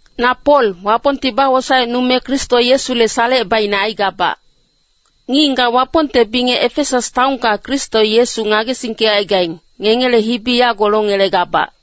Na Pol, Wapongti bawosaecnume Kristo Yesule salecebaicne aigabac. Ngic-ngigac Wapongte bingec Efesas taonka Kristo Yesu ngagesingkecaigaing, ngengele hibi yago longelegabac.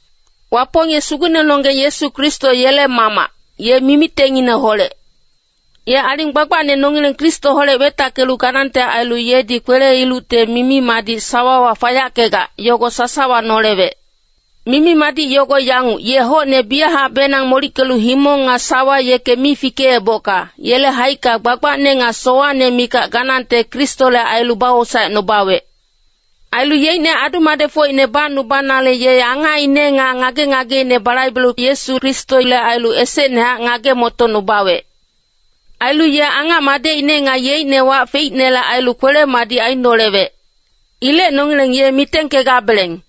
Wapong ye Sugucnenonggeng Yesu Kristo yele Mamac, ye mimitengineholec. Ye aling gbagbacne nongileng Kristoholec wetackelu ganangte ailu yedi kwele-ilucte mimi-madic sawawa fayackegac, yogo sasawa nolewec. Mimi-madic yogo yanguc, ye hocne biyachacbenang molickelu himong nga sawa yeke mi fikeebocka, yele haicka gbagbacne nga sowacne mikac ganangte Kristole ailu bawosaecnubawec. Ailu yeicne adu-madecfocine bacnubanale ye angacine nga ngage-ngageine balaibelu Yesu Kristole ailu esecnehac ngage-motocnubawec. Ailu ye angac Madecine nga yeicne wac feicnele ailu kwele-madic ainolewec. Ilec nongileng ye mitengkegabeleng.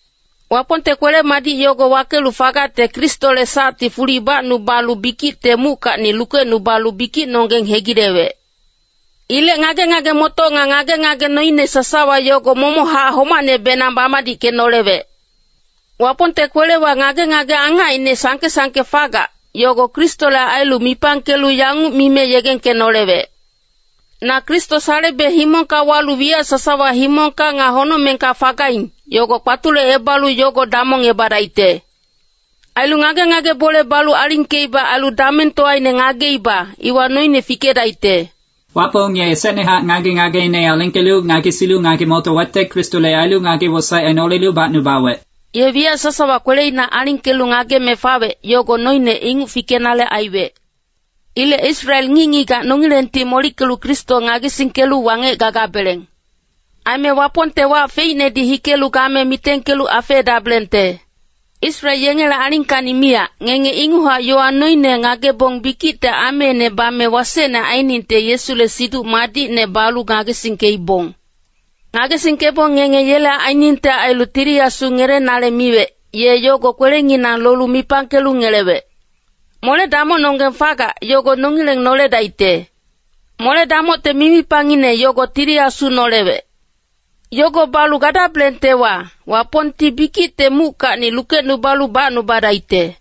Wapongte kwele-madic yogo wakelu fagacte Kristole sacti fuli bacnubalu bikicte muckacni lukecnubalu bikicnonggeng hegilewec. Ilec ngage-ngage-motoc nga ngage-ngage noine sasawa yogo momochac homacnebenang bamadickenolewec. Wapongte kwelewa ngage-ngage angacine sangke-sangke fagac, yogo Kristole ailu mipangkelu yanguc mime yegengkenolewec, “Na Kristo salebe himongka walu wiyac sasawa himongka nga honocmengka fagaing, yogo kpatulecebalu yogo damongebadaicte. Ailu ngage-ngage bole balu alingkeiba ailu damengtowaine ngageiba, iwa noine fikedaicte.” Wapong ye esecnehac ngage-ngageine alingkelu ngagesilu ngage-motowecte Kristole ailu ngage-wosaec ainolelu bacnubawec. Ye wiyac sasawa kweleina alingkelu ngageme fawec, yogo noine inguc fikenale aiwec. Ilec Israel ngic-ngigac nongilengti molickelu Kristo ngagesingkelu wangec gagabeleng. Aime Wapongte wac feicnedi hikelu game mitengkelu afeedabelengte. Israel yengele alingkacni miyac, ngenge inguchac yowa noine ngagebong bikicte ameine bame wasecne ainingte Yesule Siduc Madicne balu ngagesingkeibong. Ngagesingkebong ngenge yele ainingte ailu Tili Asu ngelenale miwec, ye yogo kwelenginang lolu mipangkelu ngelewec. Mole-damocnonggeng fagac, yogo nongileng noledaicte. Mole-damocte mimipangine yogo Tili Asu nolewec. Yogo balu gadabelengtewa, Wapongti bikicte muckacni lukecnubalu bacnubadaicte.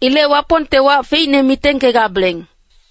Ilec Wapongte wac feicne mitengkegabeleng.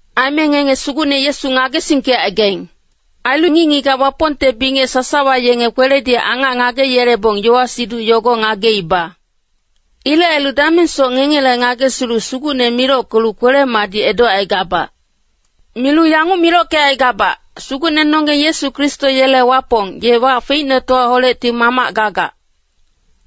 Aime ngenge Sugucne Yesu ngagesingkecaigaing. Ailu ngic-ngigac Wapongte bingec sasawa yenge kweledi angac ngageyelebong yowa-siduc yogo ngageiba. Ilec ailu damengsoc ngengele ngagesilu Sugucne milockelu kwele-madic edocaigabac. Milu yanguc milockecaigabac, Sugucnenonggeng Yesu Kristo yele Wapong, ye wac feicnetowaholecti Mamac gagac.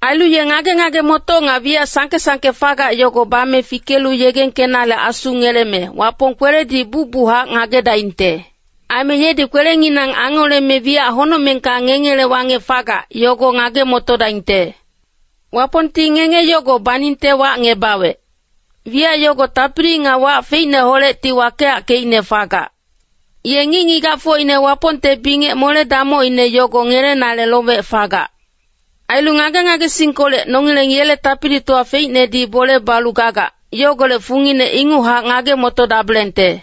Ailu ye ngage-ngage-motoc nga wiyac sangke-sangke fagac yogo bame fikelu yegengkenale Asu ngeleme, Wapong kweledi bucbuchac ngagedaingte. Aime yedi kwelenginang angoleme wiyac honocmengka ngengele wangec fagac, yogo ngage-motodaingte. Wapongti ngenge yogo baningte wacngebawec. Wiyac yogo tapili nga wac feicneholecti wakeyackeicne fagac. Ye ngic-ngigacfocine Wapongte bingec mole-damocine yogo ngelenale lowec fagac. Ailu ngage-ngagesingkolec, nongileng yele tapilitowa feicnedi bole balu gagac, yogolec fungine inguchac ngage-motodabelengte.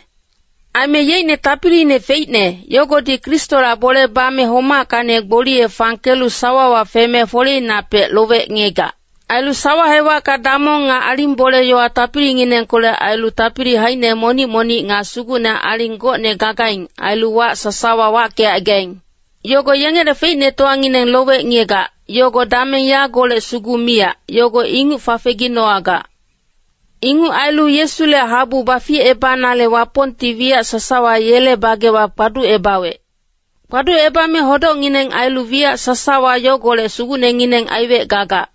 Aime yeicne tapiliine feicne, yogodi Kristola bole bame homackacni gboliye fangkelu sawawa feme foleinapec lowec ngiyegac. Ailu sawa hewacka damong nga aling bole-yowa tapilinginengkolec ailu tapili haicine monic-monic nga sugucne-aling gocne gagaing, ailu wac sasawa wackecaigaing. Yogo yengele feicnetowangineng lowec ngiyegac, yogo dameng yagolec sugu miyac, yogo inguc fafeginowagac. Inguc ailu Yesule habu baficebanale Wapongti wiyac sasawa yele bagewa kpaducebawec. Kpaducebame hodocngineng ailu wiyac sasawa yogolec sugucnengineng aiwec gagac.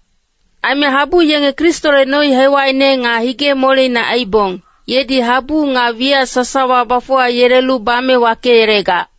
Aime habu yenge Kristole noi-hewacine nga hige-moleine aibong, yedi habu nga wiyac sasawa bafuwayelelu bame wakeyelegac.